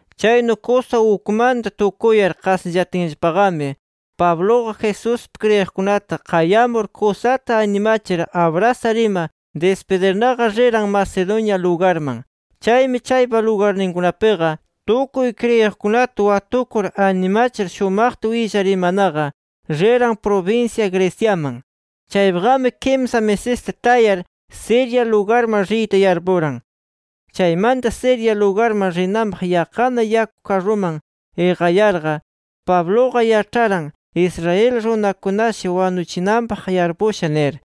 Chaynu kusa ukmanta tukuyar qasillatinllapanaqami, Pabluqa Jesuspi kriyiqkunata qayamur, kusata animachir abrasar ima dispidirnaqa riran Macedonia lugarman. Chaymi, chaypa lugarninkunapiqa tukuy kriyiqkunata watukur animachir shumaqta willar imanaqa, riran prubinsya Greciaman. Chaypiqami kimsa misista tayar, Siria lugarman riyta yarpuran. Chaymanta, Siria lugarman rinanpaq yaqqana yaku karruman iqayarqa, Pabluqa yaĉharan, Israel runakunashi wanuchinanpaq yarpusha nir.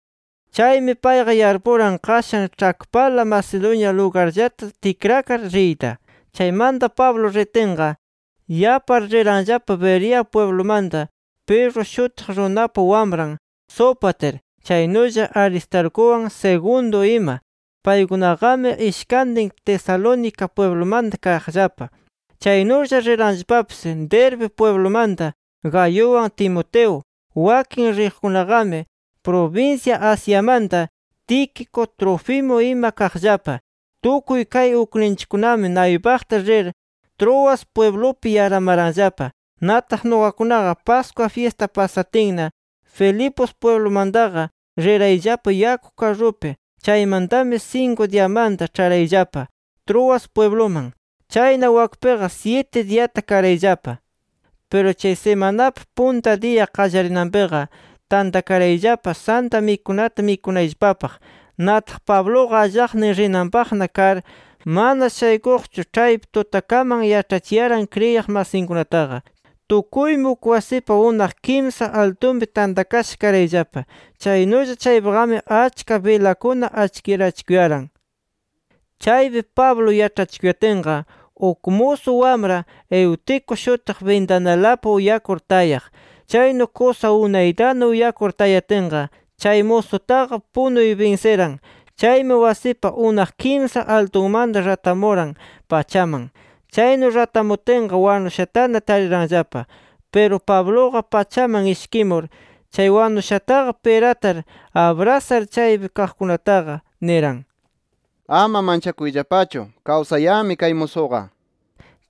Chaymi payqa yarpuran qashan ĉhakpala Macedonia lugarllata tikrakar riyta. Chaymanta Pablo ritinqa, yapar riranllapa Berea pwiblumanta Pirro shutiq runapa wamran Sópater, chaynulla Aristarcuwan Segundo ima. Paykunaqami ishkantin Tesalónica pwiblumanta kaqllapa. Chaynulla riranllapapis Derbe pwiblumanta Gayuwan Timoteo. Wakin riqkunaqami prubinsya Asiamanta Tíquico, Trófimo ima kaqllapa. Tukuy kay ukninchikkunami naypaqta rir, Troas pwiblupi yaramaranllapa. Nataq, nuqakunaqa Pascua fyista pasatinna, Filipos pwiblumantaqa rirayllapa yaku karrupi. Chaymantami, sinku diyamanta ĉharayllapa Troas pwibluman. Chayna, wakpiqa syiti diyata karayllapa. Piru chay simanapa punta diya qallarinanpiqa, tantakarayllapa Santa Mikunata mikunayllapapaq. Nataq Pabluqa allaqnin rinanpaqna kar, mana shaykuqchu ĉhaypi tutakaman yaĉhachiyaran kriyiq masinkunataqa. Tukuymi uk wasipa unaq kimsa altunpi tantakasha karayllapa. Chaynulla chaypiqami achka bilakuna achkirachikuyaran. Chaypi Pablo yaĉhachikuyatinqa, uk musu wamra Eutico shutiq bintanalapi uyakur tayaq. Chaynu kusa unaytana uyakur tayatinqa chay musutaqa punuy binsiran. Chaymi wasipa unaq kimsa altunmanta ratamuran pachaman. Chaynu ratamutinqa, wanushatana tariranllapa. Piru Pabluqa pachaman ishkimur, chay wanushataqa piratar abrasar chaypi kaqkunataqa niran: —Ama manchakuyllapachu. Kawsayanmi kay musuqa nir.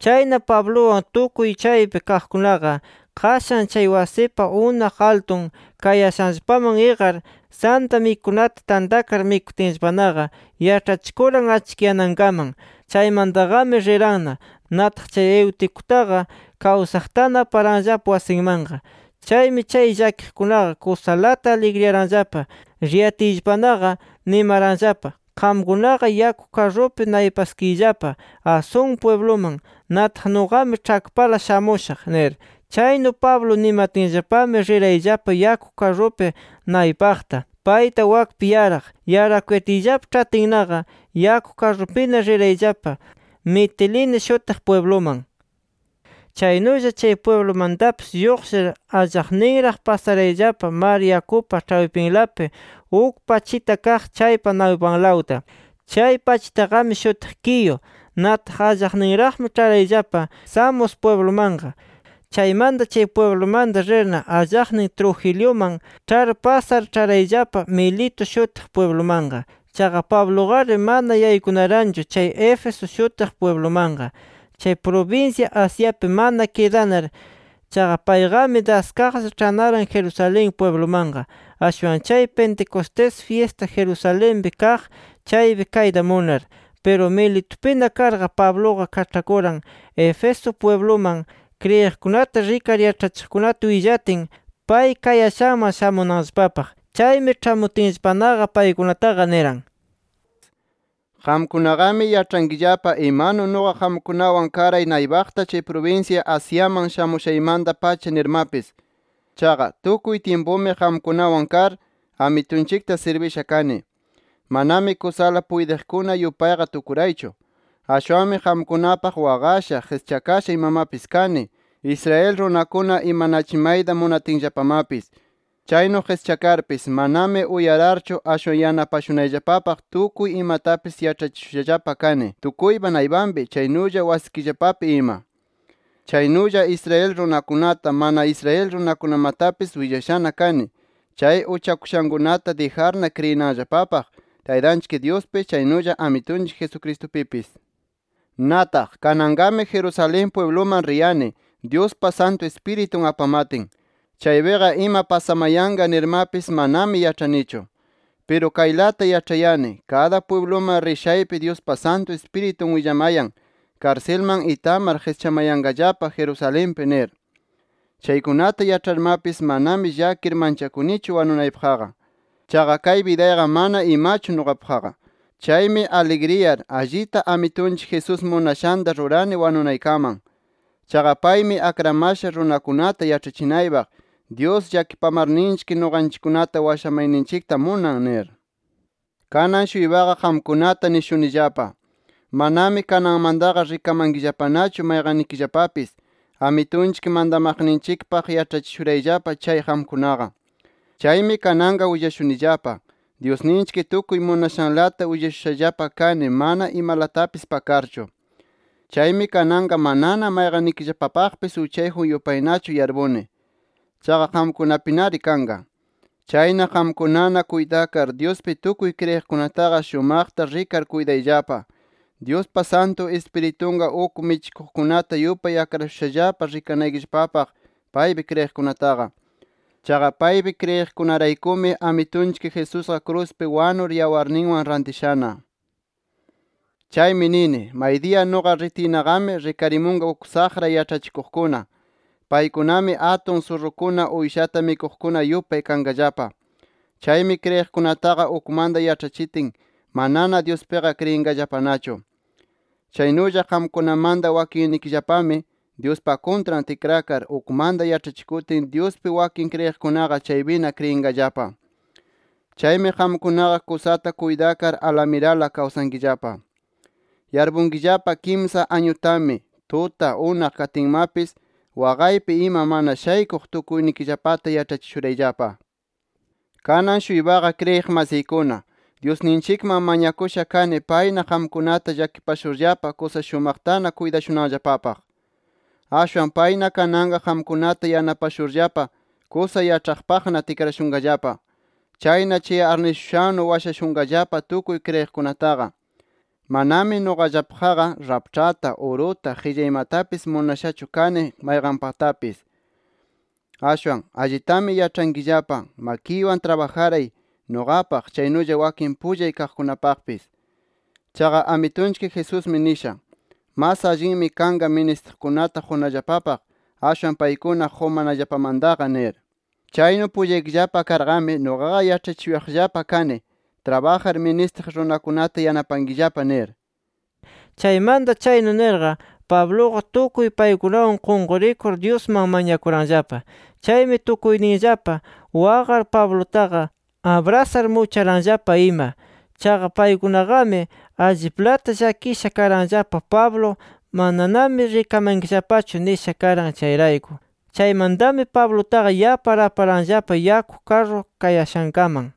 Chayna, Pabluwan tukuy chaypi kaqkunaqa qashan chay wasipa unaq altun kayashanllapaman iqar, Santa Mikunata tantakar mikutinllapanaqa, yaĉhachikuran achkiyanankaman. Chaymantaqami riranna. Nataq chay Euticutaqa kawsaqtana aparanllapa wasinmanqa. Chaymi chay llakiqkunaqa kusalata aligriyaranllapa. Riyatiyllapanaqa, nimaranllapa: “Qamkunaqa yaku karrupi naypaskiyllapa Asón pwibluman. Nataq nuqami ĉhakpala shamushaq” nir. Chaynu Pablo nimatinllapami, rirayllapa yaku karrupi naypaqta payta wakpi yaraq. Yarakuyatiyllapa ĉhatinnaqa, yaku karrupina rirayllapa Mitilene shutiq pwibluman. Chaynulla chay pwiblumantapis lluqshir, allaqninraq pasarayllapa mar yakupa ĉhaypinlapi uk pachita kaq chaypa naypanlawta. Chay pachitaqami shutiq Quío. Nataq allaqninraqmi ĉharayllapa Samos pwiblumanqa. Chaymanta chay pwiblumanta rirna, allaqnin [Trogiliuman ĉhar pasar] ĉharayllapa Mileto shutiq pwiblumanqa. Chaqa Pabluqari mana yaykunaranchu chay Éfeso shutiq pwiblumanqa, chay prubinsya Asiapi mana kidanar. Chaqa payqami daskaqlla ĉhanaran Jerusalén pwiblumanqa, ashwan chay Pentecostés fyista Jerusalenpi kaq chaypi kayta munar. Piru Miletupina karqa, Pabluqa kaĉhakuran Éfeso pwibluman, kriyiqkunata rikar yaĉhachiqkunata willatin, pay kayashanman shamunanllapapaq. Chaymi, ĉhamutinllapanaqa paykunataqa niran: “Qamkunaqami yaĉhankillapa imanu nuqa qamkunawan karay naypaqta chay prubinsya Asiaman shamushaymanta-pacha nirmapis. Chaqa, tukuy tyimpumi qamkunawan kar, Amitunchikta sirbisha kani. Manami kusala puytiqkuna yupayqa tukuraychu. Ashwanmi qamkunapaq waqasha, qischakasha imamapis kani, Israel runakuna imanachimayta munatinllapamapis. Chaynu qischakarpis, manami uyararchu ashwan yanapashunayllapapaq tukuy imatapis yaĉhachishushallapa kani tukuypa naypanpi, chaynulla wasikillapapi ima. Chaynulla Israel runakunata, mana Israel runakunamatapis willashana kani, chay uchakushankunata dijarna kriyinanllapapaq Taytanchik Dyuspi, chaynulla Amitunchik Jesucristupipis. “Nataq, kananqami Jerusalén pwibluman riyani, Dyuspa Santu Ispiritun apamatin. Chaypiqa ima pasamayanqa nirmapis manami yaĉhanichu. Piru kaylata yaĉhani, kada pwibluman rishaypi Dyuspa Santu Ispiritun willamayan, karsilman itamar qischamayanqallapa Jerusalenpi nir. Chaykunata yaĉharmapis, manami llakir manchakunichu wanunaypaqqa. Chaqa kay bidayqa mana imachu nuqapaqqa. Chaymi aligriyar, allita Amitunchik Jesús munashanta ruranani wanunaykaman. Chaqa paymi akramasha runakunata yaĉhachinaypaq: ‘Dyus llakipamarninchik nuqanchikkunata washamayninchikta munan’ nir. “Kanan-shuypaqa qamkunata nishunillapa: Manami kananmantaqa rikamankillapanachu mayqannikillapapis, Amitunchik mantamaqninchikpaq yaĉhachishurayllapa chay qamkunaqa. Chaymi kananqa willashunillapa: Dyusninchik tukuy munashanlata willashushallapa kani mana imalatapis pakarchu. Chaymi kananqa manana mayqannikillapapaqpis uchayjun yupaynachu yarpuni. Chayqa qamkunapinari kanqa. Chayna qamkunana kuytakar, Dyuspi tukuy kriyiqkunataqa shumaqta rikar kuytayllapa. Dyuspa Santu Ispiritunqa, uk michikuqkunata yupay akrashushallapa rikanaykillapapaq paypi kriyiqkunataqa. Chaqa paypi kriyiqkunaraykumi Amitunchik Jesusqa kruspi wanur yawarninwan rantishana. “Chaymi nini: Maydiya nuqa ritiynaqami rikarimunqa uk saqra yaĉhachikuqkuna. Paykunami, atun surrukuna uyshata mikuqkuna yupay kanqallapa. Chaymi kriyiqkunataqa ukmanta yaĉhachitin manana Dyuspiqa kriyinqallapanachu. Chaynulla qamkunamanta wakinnikillapami Dyuspa kuntran tikrakar, ukmanta yaĉhachikutin Dyuspi wakin kriyiqkunaqa chaypina kriyinqallapa. Chaymi qamkunaqa kusata kuytakar alamirala kawsankillapa. Yarpunkillapa kimsa añutami, tuta, unaq katinmapis, waqaypi ima, mana shaykuq tukuynikillapata yaĉhachishurayllapa. “Kanan-shuypaqa kriyiq masiykuna, Dyusninchikman mañakusha kani payna qamkunata llakipashurllapa kusa shumaqtana kuytashunanllapapaq. Ashwan payna kananqa qamkunata yanapashurllapa kusa yaĉhaqpaqna tikrashunqallapa. Chayna chay arnishushannu washashunqallapa tukuy kriyiqkunataqa. Manami nuqallapaqqa raĉhpata, uruta, qillaymatapis munashachu kani, mayqanpatapis. Ashwan allitami yaĉhankillapa, makiywan trabajaray, nuqapaq chaynulla wakin pullay kaqkunapaqpis. Chaqa Amitunchik Jesusmi nisha: ‘Mas allinmi kanqa ministiqkunata qunallapapaq, ashwan paykuna qumanallapamantaqa’ nir. Chaynu pullaykillapa karqami, nuqaqa yaĉhachishuyaqllapa kani ‘Trabajar ministiq runakunata yanapankillapa’ nir”. Chaymanta chaynu nirqa Pabluqa tukuy paykunawan qunqurikur Dyusman mañakuranllapa. Chaymi tukuyninllapa waqar Pablutaqa abrasar mucharanllapa ima. Chaqa paykunaqami alliplata llakisha karanllapa, Pablo “Mananami rikamankillapachu” nisha karan chayrayku. Chaymantami Pablutaqa yapar aparanllapa yaku karru kayashankaman.